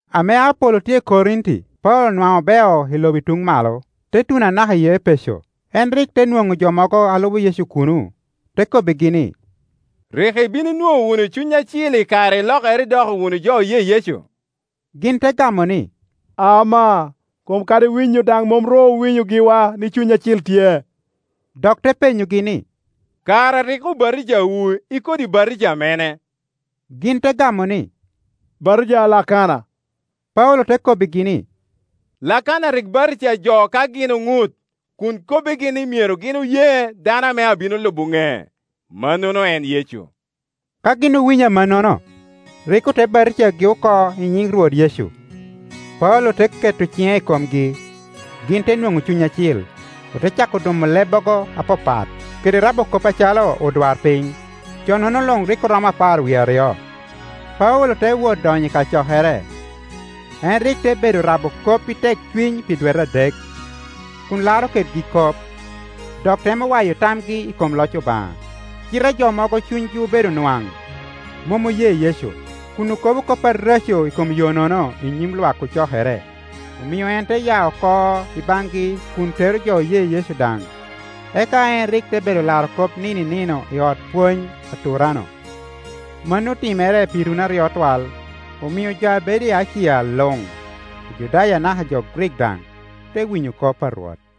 Ame Apolo tye i Korinti, Paulo nwaŋ obeo i lobo i tuŋ malo, te tuno anaka i Epeco. En rik te nwoŋo jo mogo a lubo Yecu kuno te kobbigi ni, “Rik ibin inwoŋo wunu Cuny Acil i kare ilokere idoko wunu jo oye Yecu?” Gin te gamo ni, “Amaa, kom kadi winyo daŋ mom ru owinyo giwa ni Cuny Acil tye.” Dok te penyogi ni, “Kara rik obatijawu i kodi batija mene?” Gin te gamo ni, “Batija a Lakana.” Paulo te kobbigi ni, “Lakana rik batija jo ka gin oŋut, kun kobbigi ni myero gin oye dano ame abino lubo ŋec, mannono en Yecu.” Ka gin owinyo amannono, rik ote batijagi oko i nyin Rwot Yecu. Paulo te keto ciŋe i komgi, gin te nwoŋo Cuny Acil, ote cako dumo lebbogo apapat kede rabo kop acalo odwarpiny. Jo-nono luŋ rik oromo apar wie aryo. Paulo te wot donyo i kacokere, en rik te bedo rabo kop i tekcuny pi dwete adek, kun laro kedgi kop, dok temo waya tamgi i kom loc Obaŋa. Cite jo mogo cunygi obedo nwaŋ, mom oye Yecu, kun okobo kop areco i kom Yo-nono i nyim lwak ocokere, omio en te ya oko i baŋgi kun tero jo oye Yecu daŋ; eka en rik te bedo laro kop nino i nino i ot pwony a Turano. Mano otimere pi runi aryo twal, omio jo a bedo i Acia luŋ, Ojudaya anaka jo Grik daŋ, te winyo kop a Rwot.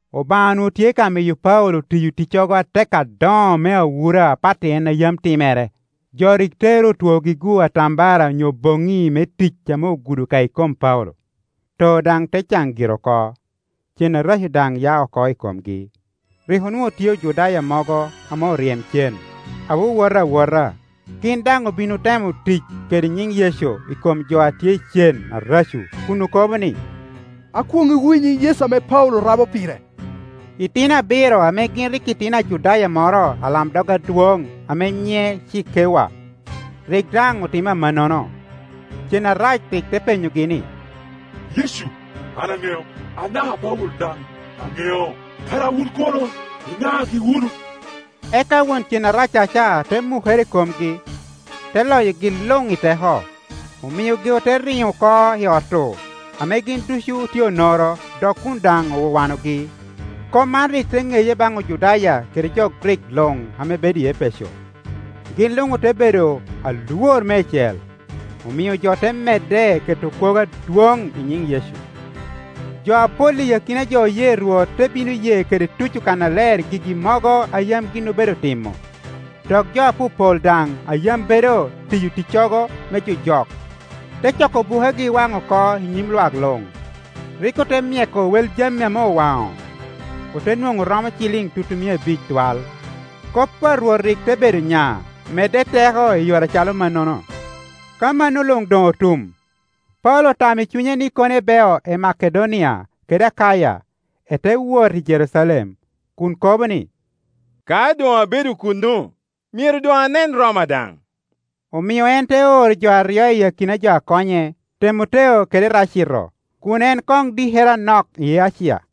Obaŋa onwoŋo tye ka miyo Paulo tiyo ticcogo atek adoŋo me awura apat i en a yam timere. Jo rik tero otwogi-gu atambara onyo boŋŋi me tic ame ogudo ka i kom Paulo, too daŋ te caŋ gire oko, ceŋ areco daŋ ya oko i komgi. Rik onwoŋo tye Ojudaya mogo ame oryem cen, a wowota awowot; gin daŋ obin otemo tic kede nyiŋ Yecu i kom jo a tye i cen areco, kun okobo ni, “Akwoŋŋiwu i nyiŋ Yecu ame Paulo rabo pire.” Itino abiro ame gin rik otino Ajudaya moro ame alamdog adwoŋ ame nyiŋe Cikewa, rik daŋ otimo amannono. Cen arac rik te penyogi ni, “Yecu an aŋeo, anaka Paulo daŋ aŋeo; kara wun kono iŋagi wunu?” Eka won cen araccaca te mukere i komgi, te loyogi luŋ i teko; omiogi ote riŋo oko i ot-tu ame gin ducu otye onoro dok kun daŋ owawanogi. Kop man rik te ŋeye baŋ Ojudaya kede jo Grik luŋame bedo i Epeco. Gin luŋ ote bedo alwor meicel, omio jo te medde keto kwogo adwoŋ i nyin Yecu. Jo apol i akina jo oye Rwot te bino ye kede tuco kannaler gigi mogo a yam gin obedo timo. Dok jo apopol daŋ a yam bedo tiyo ticcogo me jojok, te coko bukegi wano oko i nyim lwak luŋ. Rik ote myeko wel jami ame owaŋo, ote nwoŋo oromo ciliŋ tutumia abic twal. Kop a Rwot rik te bedo nya, medde i teko i yore acalo mannono. Ka mano luŋdoŋ otum, Paulo otamo i cunye ni kono ebeo i Makedonia kede Akaya, ete wot i Jerucalem, kun kobo ni, “Ka doŋabedo kuno, myero doŋanen Roma daŋ.” Omio en te oro jo aryo i akina jo a konye, Temoteo kede Eracito, kun en koŋ dikere anok i Acia.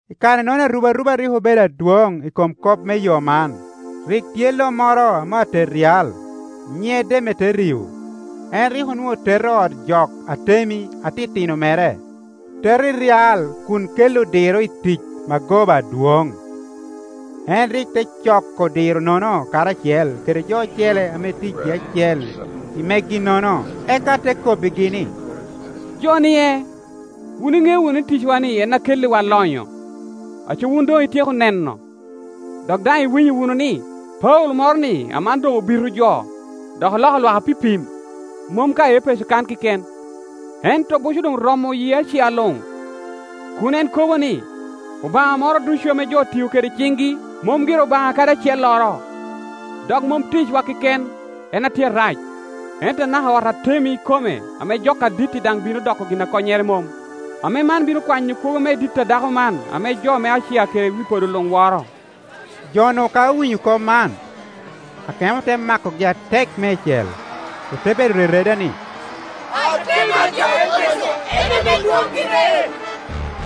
I kare-nono arubaruba rik obedo adwoŋ i kom kop me Yo man. Rik tye lo moro ame atet ryal, nyine Demeterio, en rik onwoŋo teto ot jok Atemi atitino moro, teto i ryal kun kelli odiro i tic magoba adwoŋ. En rik te coko odiro-nono karacel kede jo ocele ame ticgi acel i megi-nono, eka te kobbigi ni, “Jo-nie, wun iŋeo wunu ni ticwa-ni en a kelliwa lonyo. Aco wun doŋityeko neno, dok daŋ iwinyo wunu ni, Paulo moro-ni aman doŋobito jo dok oloko lwak apipim, mom ka i Epeco kan keken, ento buco doŋromo yi Acia luŋ, kun en kobo ni, obaŋa moro ducu ame jo tio kede ciŋgi mom gire obaŋa kadi acelloro. Dok mom ticwa keken en a tye arac, ento anaka ot Atemi ikome ame jok adit-ti daŋ bino doko gin a konynere mom, ame man bino kwanyo kwogo me dit a dako man ame jo me Acia kede wi podo luŋworo.” Jo-nu ka owinyo kop man, akemo te makogi atek meicel, ote bedo rereda ni, “Atemi a jo Epeco en ame dwoŋ gire!”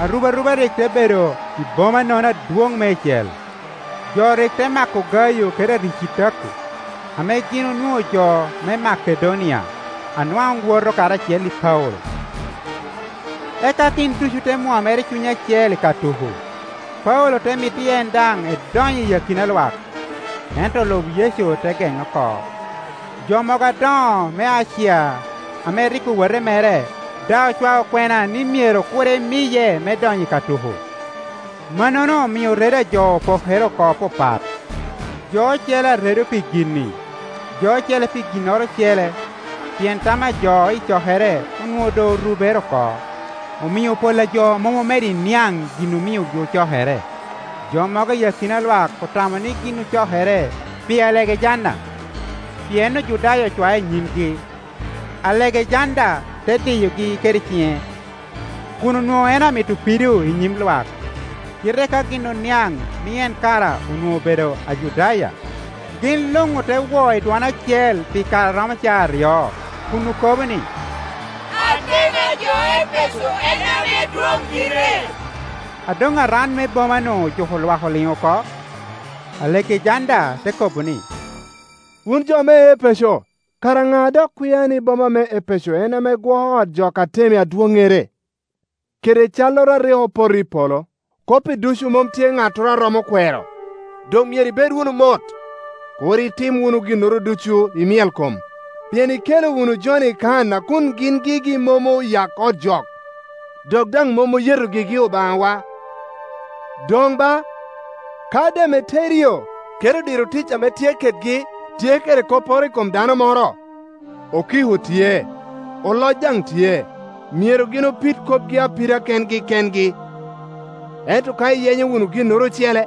Arubaruba rik te bedo i bomanono adwoŋ meicel; jo rik te mako Gayo kede Aricitako, ame gin onwoŋo jo me Makedonia a nwaŋ woto karacel i Paulo, eka gin ducu te mwomere i cuny acel i ka tuko. Paulo te mito ni en daŋ edony i akina lwak, ento olub Yecu te geŋe oko. Jo mogo a doŋo me Acia ame rik owote mere daŋ ocwaye kwena ni myero kur emiye me donyo i ka tuko. Mannono omio redo a jo opokere oko papat, jo ocele aredo pi gin-ni, jo ocele pi ginnoro ocele; pien tam a jo i cokere onwoŋo doŋ orubere oko, omio pol a jo mom omedo i niaŋ gin omiogi ocokere. Jo mogo i akina lwak otamo ni gin ocokere pi Alegejanda, pien Ojudaya ocwae i nyimgi. Alegejanda te diyogi kede ciŋe, kun onwoŋo en amito pido i nyim lwak. Cite ka gin oniaŋ ni en kara onwoŋo obedo Ajudaya, gin luŋ ote wo i dwon acel pi kare a romo caa aryo, kun okobo ni, “Atemi a jo Epeco en ame dwoŋ gire!” A doŋ aran me boma-nu ojuko lwak oliŋ oko, Alegejanda te kobo ni, “Wun jo me Epeco, kara ŋa a dok kwia ni boma me Epeco en ame gwoko ot jok Atemi adwoŋŋere, kede calloro a rik opoto i polo? Kop-pi ducu mom tye ŋattoro a romo kwero; doŋ myero ibed wunu mot, kur itim wunu ginnoro ducu i myelkom. Pien ikelo wunu jo-ni kan a kun gin gigi mom oyak ot jok, dok daŋ mom oyeto gigi obaŋawa. Doŋ ba, ka Demeterio kede odiro tic ame tye kedgi tye kede kopporo i kom dano moro, okiko tye, oloc daŋ tye; myero gin opid kopgi apida kengi kengi. Ento ka iyenyo wunu ginnoro ocele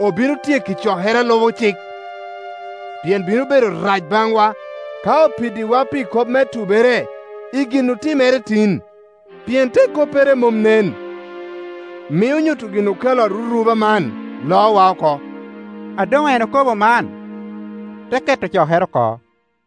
obino tyeko i cokere a lubo cik. Pien bino bedo rac baŋwa, ka opiddiwa pi kop me tubere i gin otimere tin, pien te koppere mom nen, mio nyuto gin okelo aruruba man loowa oko.” A doŋ en okobo man, te keto cokere oko.